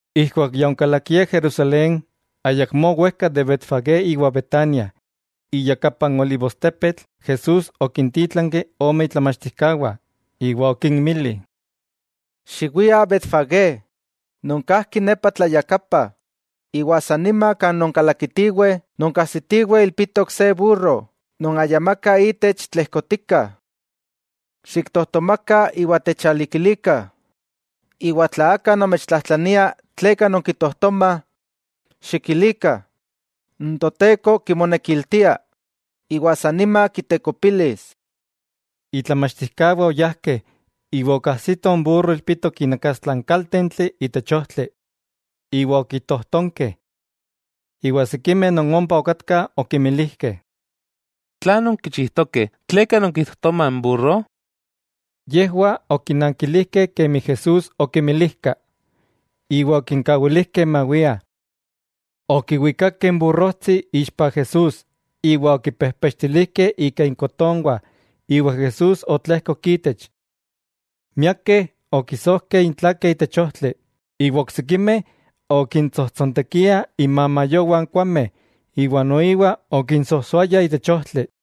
Ijkuak ya onkalakiah Jerusalén, ayakmó wejka de Betfagé iwa Betania, iyakapa n olivostepetl, Jesús okintítlanki ome itlamachtijkawah, iwa okinmili: —Xiwiah Betfagé, non kajki nepa tlayakapa, iwa san nima kan nonkalakitiweh nonkajsitiweh ilpitok se burro non ayamaka itech tlejkotika. Xiktojtomakah iwa techalikilikah. Iwa tla aka nomechtlajtlania tleka nonkitojtomah, xikilikah, n Toteko kimonekiltia, iwa san nima kitekopilis. Itlamachtijkawah oyajkeh iwa okajsitoh n burro ilpitok inakastla n kaltentli itech ojtli, iwa okitojtonkeh. Iwa sikimeh non ompa okatkah okimilijkeh: —¿Tlan nonkichijtokeh? ¿Tleka nonkitojtomah n burro? Yejwah okinnankilijkeh kemi Jesús okimilijka, iwa okinkawilijkeh mawiah. Okiwikakeh n burrojtsi ixpa Jesús, iwa okipejpechtilijkeh ika inkotonwah iwa Jesús otlejkok itech. Miakeh okisojkeh intlakeh itech ojtli, iwa oksikimeh okintsojtsontekiah inmamayowah n kuaujmeh iwa okinsojsóayah itech ojtli.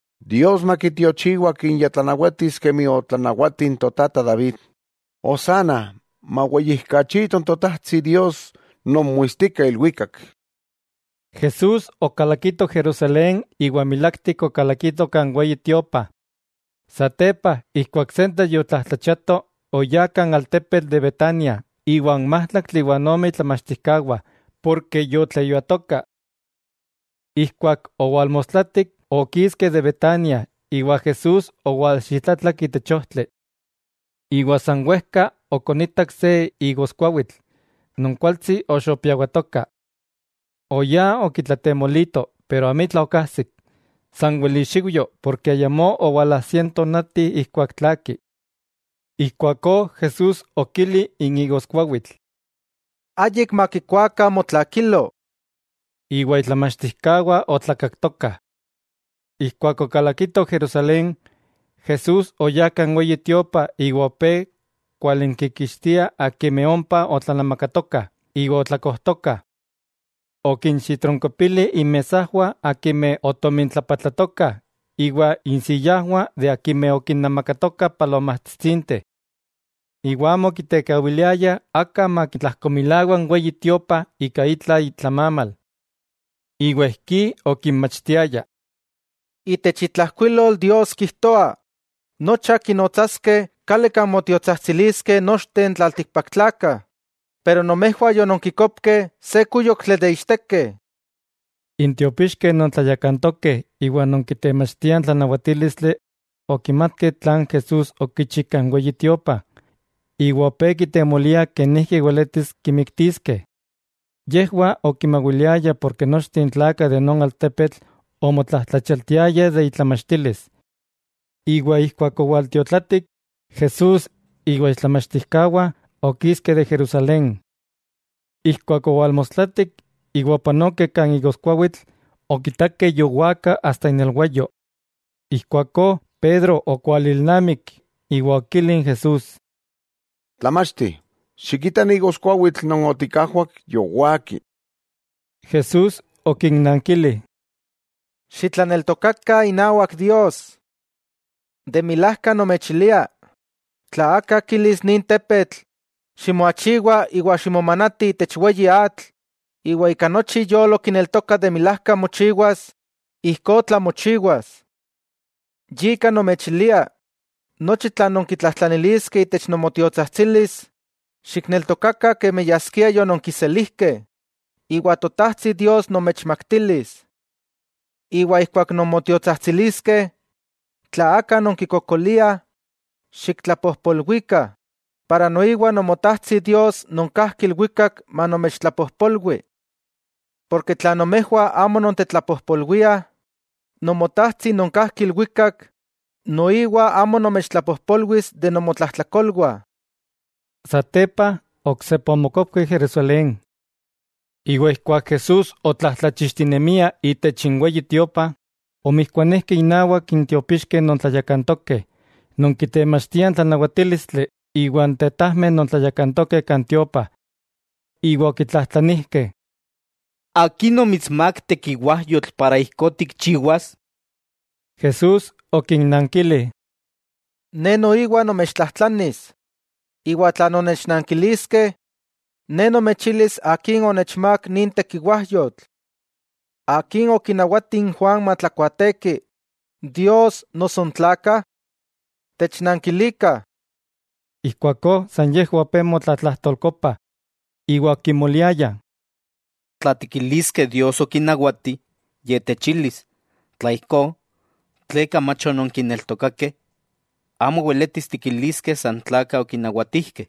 ¡Dios makitiochiwa Akin ya tlanawatis kemi otlanawati n totata David! ¡Hosanna! ¡Maweyijkachito Totajtsi Dios non moitstika ilwikak! Jesús okalakito Jerusalén iwa milaktik okalakito kan Weyi Tiopa. Satepa ijkuak sentetl yotlajtlachiato, oyá kan altepetl de Betania iwa n májtlaktli iwa ome itlamachtijkawah porke yotleyuatoka. Ijkuak owalmostlatik okiskeh de Betania iwa Jesús owalxitlatlak itech ojtli. Iwa san wejka okonitak se igoskuawitl non kualtsi oxopiawatoka. Oyá okitlatemolito, pero amitla okajsik, sanwel ixiujyo ken ayamó owalajsia n tonati ijkuak tlaaki. Ijkuakó Jesús okili n igoskuawitl: —¡Ayik makikuakah motlakilo! Iwa itlamachtijkawah otlakaktokah. Ijkuak okalakitoh Jerusalén, Jesús oyá kan Weyi Tiopa iwa opé kualinkikixtia akimeh ompa otlanamakatokah iwa otlakojtokah. Okinxitronkopili inmesajwah akimeh otomintlapatlatokah iwa insiyajwah akimeh okinemakatokah palomajtsitsinteh. Iwa amo okitekawiliaya aka makitlajkomilawa n Weyi Tiopa ika itla itlamamal. Iwa ijkí okinmachtiaya: —Itech itlajkuilol Dios kijtoa: “Nocha kinotsaskeh kali kan motiotsajtsiliskeh nochteh n tlaltikpaktlakah”, pero nomejwah yononkikopkeh se kúyoktli de ichtekeh. N tiopixkeh non tlayakantokeh iwa non kitemachtiah n tlanawatílistli okimatkeh tlan Jesús okichi kan Weyi Tiopa, iwa opé kitemoliah kenijki weletis kimiktiskeh. Yejwah okimawiliayah porke nochteh n tlakah de non altepetl omotlajtlachialtiayah de itlamachtilis. Iwa ijkuak owaltiotlatik, Jesús iwa itlamachtijkawah okiskeh de Jerusalén. Ijkuak owalmostlatik, iwa opanokeh kan igoskuawitl, okitakeh yowaka asta inelwayo. Ijkuakó Pedro okualilnamik, iwa okili n Jesús: —Tlamachti, xikita, n igoskuawitl non otikajwak yowaki. Jesús okinnankili: —Xitlaneltokakah inawak Dios. De milajka nomechilia, tla aka kilis nin tepetl: “Ximoachiwa iwa ximomanati itech weyi atl”, iwa ika nochi iyolo kineltoka milák mochiwas, ijkó tlamochiwas. Yika nomechilia: Nochi tlan nonkitlajtlaniskeh itech nomotiotsajtsilis, xikneltokakah kemi yaskia yononkiselijkeh, iwa Totajtsi Dios nomechmaktilis. Iwa ijkuak non motiotsajtsiliskeh, tla aka nonkikokoliah, xiktlapojpolwikah, ijkó noiwa Nomotajtsi Dios non kajki ilwikak manomechtlapojpolwi. Tla nomejwah amo nontetlapojpolwiah, Nomotajtsi non kajki ilwikak, noiwa amo nomechtlapojpolwis de nomotlajtlakolwah. Satepa oksepa omokopkeh Jerusalén. Iwa ijkuak Jesús otlajtlachixtinemia itech n Weyi Tiopa, omijkuanijkeh inawak n tiopixkeh non tlayakantokeh, non kitemachtiah n tlanawatílistli iwa n tetajmeh non tlayakantokeh kan tiopa, iwa okitlajtlanijkeh: —¿Akin omitsmák tekiwajyotl para ijkó tikchiwas? Jesús okinnankili: —Ne noiwa nomechtlajtlanis, iwa tla nonnechnankiliskeh, Ne nomechilis akin onechmák nin tekiwajyotl. ¿Akin okinawati n Juan matlakuaateki, Dios noso n tlakah? Technankilikah. Ijkuakó san yejwah opé motlatlajtolkopah, iwa okimoliayah: —Tla tikiliskeh Dios okinawati, Ye techilis: “Tla ijkó, ¿tleka mach ononkineltokakeh?” Amo weletis tikiliskeh san tlakah okinawatijkeh.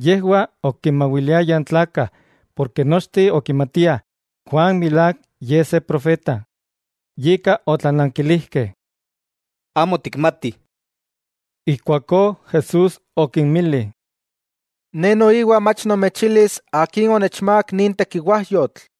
Yejwah okinmawiliayah n tlakah porke nochteh okimatiah Juan milák ye se profeta. Yika, otlanankilijkeh: —Amo tikmatih. Ijkuakó Jesús okinmili: —Ne noiwa mach nomechilis akin onechmák nin tekiwajyotl.